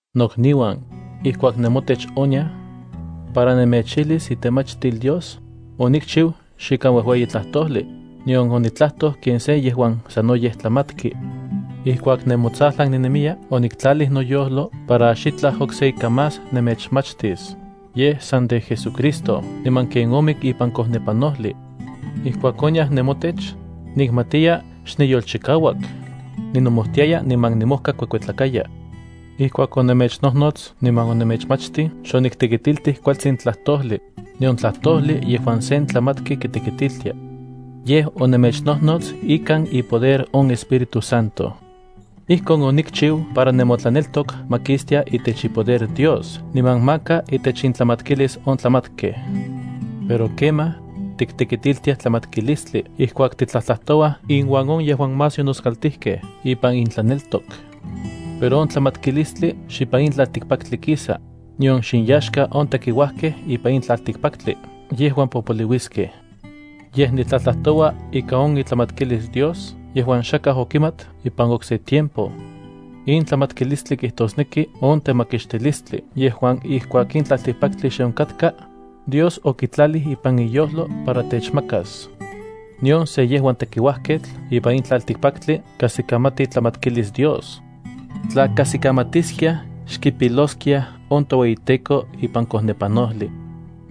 Nokniuan, ijkuak nemotech oniaj para nemechijlis itemachtil Dios, onikchiu xikan uejueyi tlajtojli, nion onitlajtoj ken se yejuan sanoyej tlamatki. Ijkuak nemotsajlan ninemiya oniktlalij noyojlo para xitlaj okse ika más nemechmachtis, yej san de JesuCristo niman ken omik ipan kojnepanojli. Ijkuak oniaj nemotech, nikmatiya xniyolchikauak, ninomojtiaya niman nimojkakuekuetlakaya. Ijkuak onemechnojnots niman onemechmachtij xoniktekitiltij kualtsin tlajtojli, nion tlajtojli yejuan sen tlamatki kitekitiltia. Yej, onemechnojnots ikan ipoder on Espíritu Santo. Ijkon onikchiu para nemotlaneltok ma kistia itech ipoder Dios niman maka itech intlamatkilis on tlamatkej. Pero kemaj, tiktekitiltiaj tlamatkilistli ijkuak titlajtlajtouaj inuan on yejuan más yonoskaltijkej ipan intlaneltok. Pero on tlamatkilistli xipan in tlaltikpaktli kisa, nion xinyaxka on tekiuajkej ipan in tlaltikpaktli yejuan popoliuiskej. Yej, nitlajtlajtoua ika on itlamatkilis Dios yejuan xakaj okimat ipan okse tiempo. In tlamatkilistli kijtosneki on temakixtilistli yejuan ijkuak in tlaltikpaktli xe onkatka, Dios okitlalij ipan iyojlo para techmakas. Nion se yejuan tekiuajketl ipan in tlaltikpaktli kajsikamati itlamatkilis Dios. Tla kajsikamatiskiaj xkipiloskiaj on toueyiTEKO ipan kojnepanojli.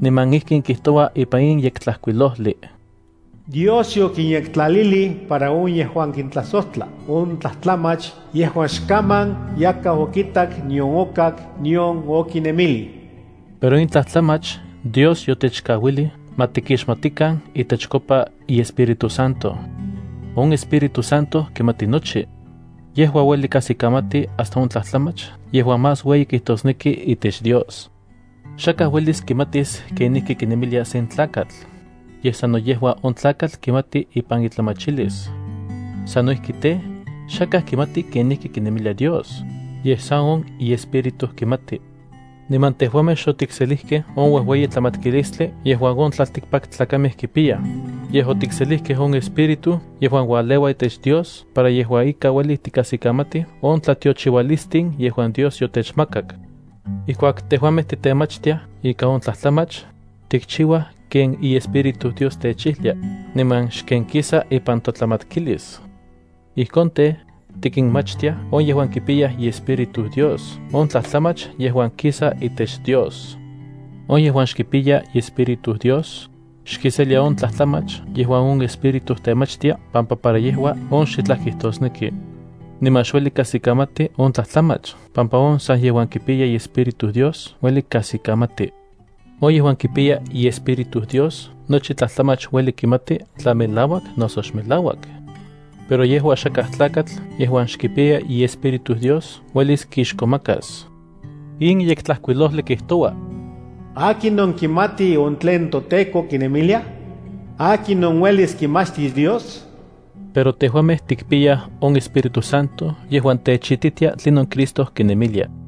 Niman ijkin kijtoua ipan in Yektlajkuilojli: Dios yokinyektlalilij para on yejuan kintlajsojtla tlajtlamach on yejuan xkaman yakaj okitak nion okak nion okinemilij. Pero in tlajtlamach Dios yotechkauilij ma tikixmatikan itechkopa iEspíritu Santo. On Espíritu Santo kimati nochi. Yejua ueli kajsikamati hasta on tlajtlamach yejuan más ueyi kijtosnekij itech Dios. Xakaj uelis kimatis kenijki kinemilia sen tlakatl, yej sano yejua on tlakatl kimati ipan itlamachilis. Sano ijki tej, xakaj kimati kenijki kinemilia Dios, yej san on iEspíritu kimati. Niman tejuamej xotikselijkej on uejueyi tlamatkilistli yejuan on tlaltikpaktlakamej kipiyaj, yej otikselijkej on Espíritu yejuan ualeua itech Dios para yejua ika ueli tikajsikamatij on tlatiochiualistin yejuan Dios yotechmakak. Ijkuak tejuamej titemachtiaj ika on tlajtlamach, tikchiuaj ken iEspíritu Dios techijlia, niman xken kisa ipan totlamatkilis. Ijkon tej, tikinmachtiaj on yejuan kipiyaj iEspíritu Dios on tlajtlamach yejuan kisa itech Dios. On yejuan xkipiya iEspíritu Dios, xkiselia on tlajtlamach yejuan on Espíritu temachtia pampa para yejua on xitlaj kijtosneki. Niman xueli kajsikamati on tlajtlamach pampa on san yejuan kipiya iEspíritu Dios ueli kajsikamati. On yejuan kipiya iEspíritu Dios nochi tlajtlamach ueli kimati tla melauak noso xmelauak. Pero yejua xakaj tlakatl yejuan xkipiya iEspíritu Dios uelis kixkomakas. In Yektlajkuilojli kijtoua: “¿Akinon kimati on tlen toTEKO kinemilia? ¿Akinon uelis kimachtis Dios?” Pero tejuamej tikpiyaj on Espíritu Santo yejuan techititia tlinon Cristo kinemilia.